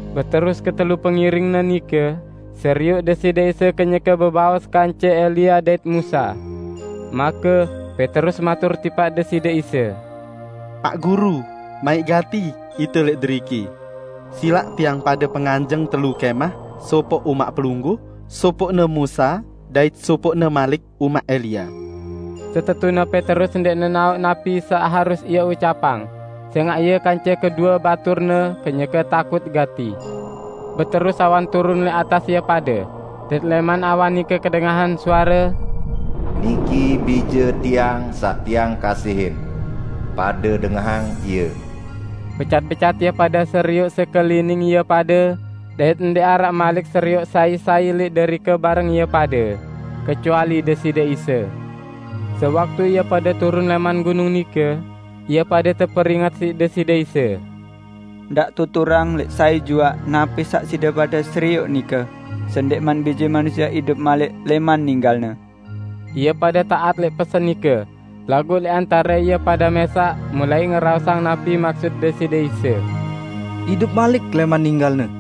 Beterus ketelu pengiring-Ne nike serioq Deside Isa kenyeke bebaos kance Elia dait Musa. Make Petrus matur tipaq Deside Isa, "Paq Guru, maiq gati ite lẽq deriki. Silaq tiang pade penganjeng telu kẽmah, sopoq umaq Pelungguh, sopoqne Musa dait sopoqne malik umaq Elia." Setetune Petrus ndẽq nenaoq napi saq harus ie ucapang, sẽngaq ie kance kedue baturne kenyeke takut gati. Beterus awan turun lẽq atas ie pade, dait lẽman awan nike kedengahan suare, "Niki Bije Tiang saq Tiang kasihin. Pade dengahang Ie!" Becat-becat ie pade serioq sekelining ie pade, dait ndẽq araq malik serioq sai-sai lẽq derike bareng ie pade, kecuali Deside Isa. Sewaktu ie pade turun lẽman gunung nike, ie pade teperinget siq Deside Isa, "Ndaq tuturang lẽq sai juaq napi saq side pade serioq nike, sendẽqman Bije Manusie idup malik lẽman ninggal-Ne." Ie pade taat lẽq pesen nike, laguq lẽq antare ie pade mẽsaq mulai ngeraosang napi maksut Deside Isa, "Idup malik lẽman ninggal-Ne".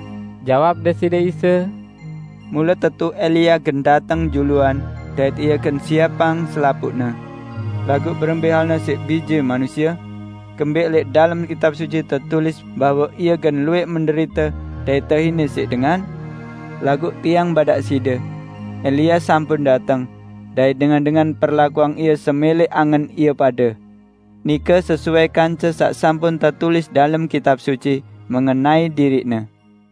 Jawab Deside Isa, "Mule tetu Elia gen dateng juluan dait ie gen siepang selapuqne. Laguq berembẽ halne siq Bije Manusie? Kembẽq lẽq dalem Kitab Suci tetulis bahwe Ie gen luwẽq menderite dait tehine siq dengan? Laguq Tiang badaq side: Elia sampun dateng, dait dengan-dengan perlakuang ie semẽlẽ angen ie pade. Nike sesuai kance saq sampun tetulis dalem Kitab Suci mengenai diriqne."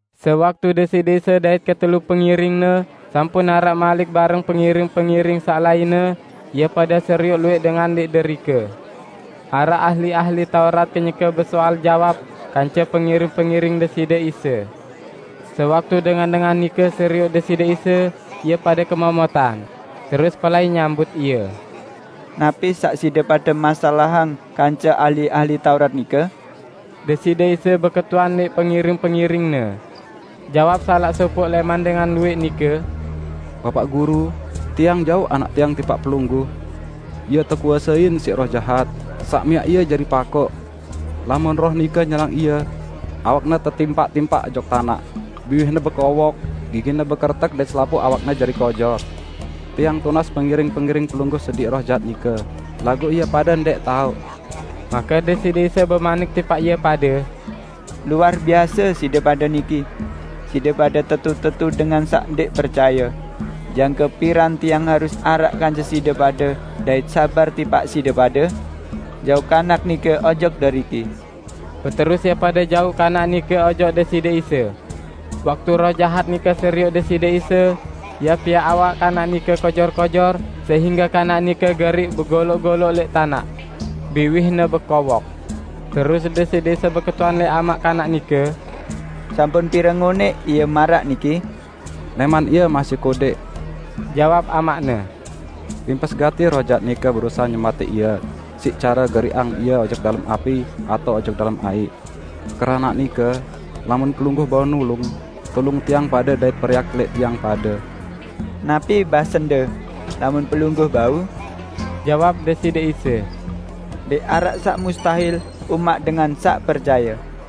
Sewaktu Deside Isa dait ketelu pengiring-Ne sampun araq malik bareng pengiring-pengiring saq lainne, ie pade serioq luwẽq dengan lẽq derike. Araq ahli-ahli Taurat kenyeke besoal jawab kance pengiring-pengiring Deside Isa. Sewaktu dengan-dengan nike serioq Deside Isa, ie pade kemomotan, terus pelai nyambut Ie. "Napi saq side pade masalahang kance ahli-ahli Taurat nike?" Deside Isa beketuan lẽq pengiring-pengiring-Ne. Jawab salaq sopoq lẽman dengan luwẽq nike, "Bapaq Guru, tiang jauq anak tiang tipaq Pelungguh. Ie tekuasein siq roh jahat saq miaq ie jari pakoq. Lamun roh nike nyerang ie, awakne tetimpak-timpak ojok tanaq, biwihne bekowok, gigine bekeretek dait selapuq awakne jari kojor. Tiang tunas pengiring-pengiring Pelungguh sediq roh jahat nike, laguq ie pade ndẽq tao." Make Deside Isa bemanik tipaq ie pade, "Luar biase side pade niki! Side pade tetu-tetu dengan saq ndẽq percaye. Jangke piran Tiang harus araq kance side pade dait sabar tipaq side pade? Jauq kanak nike ojok deriki!" Beterus ie pade jauq kanak nike ojok Deside Isa. Waktu roh jahat nike serioq Deside Isa, ie piaq awak kanak nike kojor-kojor sehingge kanak nike geriq begoloq-goloq lẽq tanaq. Biwihne bekowok. Terus Deside Isa beketuan lẽq amaq kanak nike, "Sampun pire ngonẽq ie maraq niki?" "Lẽman ie masih kodẽq!" jawab amaqne. "Rimpes gati roh jahat nike berusahe nyematẽq ie siq care geriqang ie ojok dalem api atao ojok dalem aiq. Keranaq nike lamun Pelungguh bau nulung, tulung tiang pade dait periak lẽq tiang pade!" "Napi basende? Lamun Pelungguh bau?" jawab Deside Isa. "Ndẽq araq saq mustahil umaq dengan saq percaye!"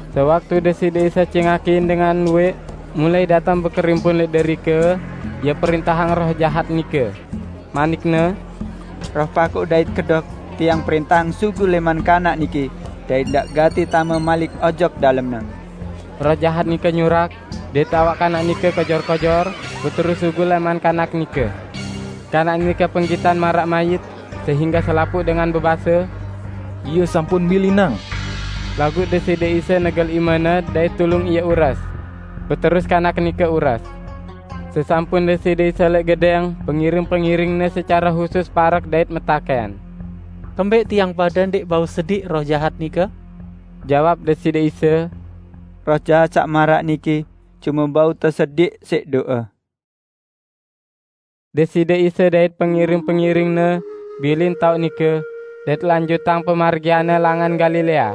Sewaktu Deside Isa cingakin dengan luwẽq mulai dateng bekerimpun lẽq derike, Ie prẽntahang roh jahat nike. Manik-Ne, "Roh pakoq dait kedok, Tiang prẽntahang sugul lẽman kanak niki dait ndaq gati tame malik ojok dalemne." Roh jahat nike nyurak, dait awak kanak nike kojor-kojor, beterus sugul lẽman kanak nike. Kanak nike penggitan maraq mayit sehingge selapuq dengan bebase, "Ie sampun milinang!" Laguq Deside Isa negel imene dait tulung ie ures. Beterus kanak nike ures. Sesampun Deside Isa lẽq gedẽng, pengiring-pengiring-Ne secare husus parek dait metakẽn, "Kembẽq tiang pade ndẽq bau sediq roh jahat nike?" Jawab Deside Isa, "Roh jahat saq maraq niki cume bau tesediq siq do'e." Deside Isa dait pengiring-pengiring-Ne bilin taoq nike, dait lanjutang pemargian-Ne langan Galilea.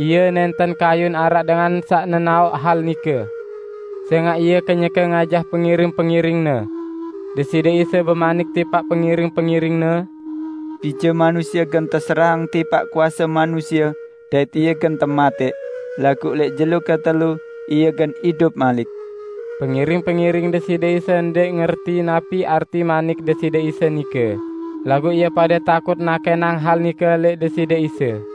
Ie nẽnten kayun araq dengan saq nenaoq hal nike; sẽngaq Ie kenyeke ngajah pengiring-pengiring-Ne. Deside Isa bemanik tipaq pengiring-pengiring-Ne, "Bije Manusie gen teserahang tipaq kuase manusie dait Ie gen tematẽq, laguq lẽq jelo ketelu Ie gen idup malik!" Pengiring-pengiring Deside Isa ndẽq ngerti napi arti manik Deside Isa nike, laguq ie pade takut nakẽnang hal nike lẽq Deside Isa.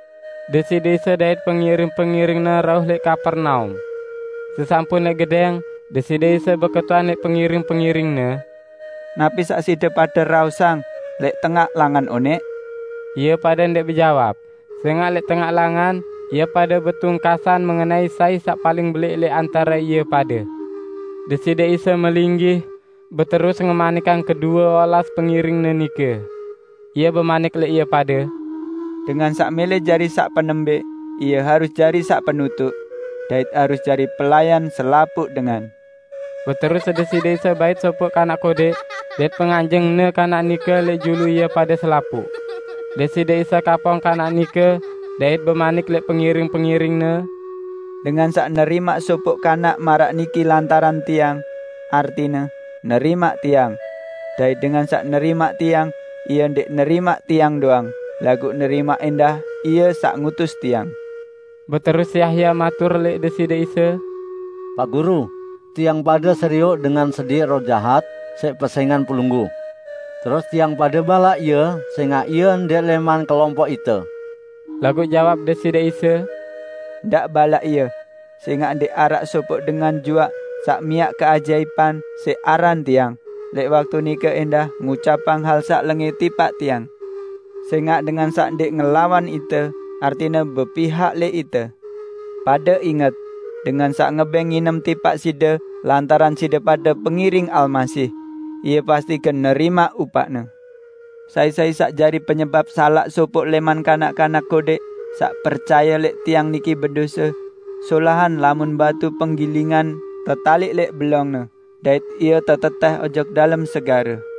Deside Isa dait pengiring-pengiring-Ne rauh lẽq Kapernaum. Sesampun lẽq gedẽng, Deside Isa beketuan lẽq pengiring-pengiring-Ne, "Napi saq side pade raosang lẽq tengaq langan onẽq?" Ie pade ndẽq bejawab, sẽngaq lẽq tengaq langan ie pade betungkasan mengenai sai saq paling belẽq lẽq antare ie pade. Deside Isa melinggih, beterus ngemanikang kedue olas pengiring-Ne nike. Ie bemanik lẽq ie pade, "Dengan saq mẽlẽ jari saq penembẽq, ie harus jari saq penutuq dait harus jari pelayan selapuq dengan." Beterus Deside Isa bait sopoq kanak kodẽq, dait penganjeng-Ne kanak nike lẽq julu ie pade selapuq. Deside Isa kapong kanak nike dait bemanik lẽq pengiring-pengiring-Ne, "Dengan saq nerimaq sopoq kanak maraq niki lantaran Tiang, artine nerimaq Tiang. Dait dengan saq nerimaq Tiang, ie ndẽq nerimaq Tiang doang, laguq nerimaq ẽndah Ie saq ngutus Tiang." Beterus Yahya matur lẽq Deside Isa, "Paq Guru, tiang pade serioq dengan sediq roh jahat siq pesẽngan Pelungguh. Terus tiang pade balaq ie sẽngaq ie ndẽq lẽman kelompoq ite." Laguq jawab Deside Isa, "Ndaq balaq ie, sẽngaq ndẽq araq sopoq dengan juaq saq miaq keajaipan siq aran Tiang, lẽq waktu nike ẽndah ngucapang hal saq lengẽ tipaq Tiang. Sẽngaq dengan saq ndẽq ngelawan ite, artine bepihak lẽq ite. Pade inget! Dengan saq ngebẽng nginem tipaq side lantaran side pade pengiring Almasih, ie pasti gen nerimaq upaqne." "Sai-sai saq jari penyebap salaq sopoq lẽman kanak-kanak kodẽq saq percaye lẽq Tiang niki bedose, solahan lamun batu penggilingan tetaliq lẽq belongne, dait ie tetetẽh ojok dalem segare.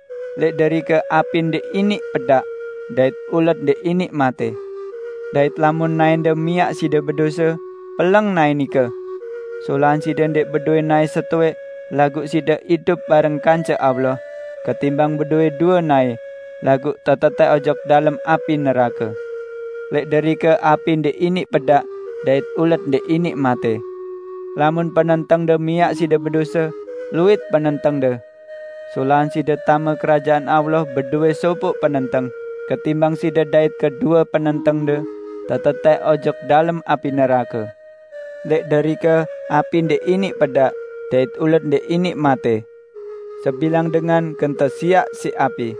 Lẽq derike api ndẽq iniq pedaq, dait ulet ndẽq iniq matẽ.] Dait lamun naẽnde miaq side bedose, peleng naẽ nike. Solahan side ndẽq bedowẽ naẽ setowẽq laguq side idup bareng kance Allah, ketimbang bedowẽ due naẽ, laguq tetetẽh ojok dalem api nerake. [ Lẽq derike api ndẽq iniq pedaq dait ulet ndẽq iniq matẽ.] Lamun penentengde miaq side bedose, luit penentengde! Solahan side tame Kerajaan Allah bedowẽ sopoq penenteng, ketimbang side dait kedue penentengde tetetẽh ojok dalem api nerake. Lẽq derike api ndẽq iniq pedaq dait ulet ndẽq iniq matẽ. Sebilang dengan gen tesiaq siq api.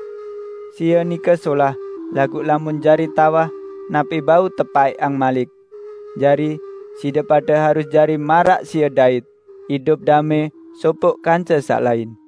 Sie nike solah, laguq lamun jari tawah, napi bau tepaẽqang malik? Jari, side pade harus jari maraq sie dait -- idup damẽ sopoq kance saq lain."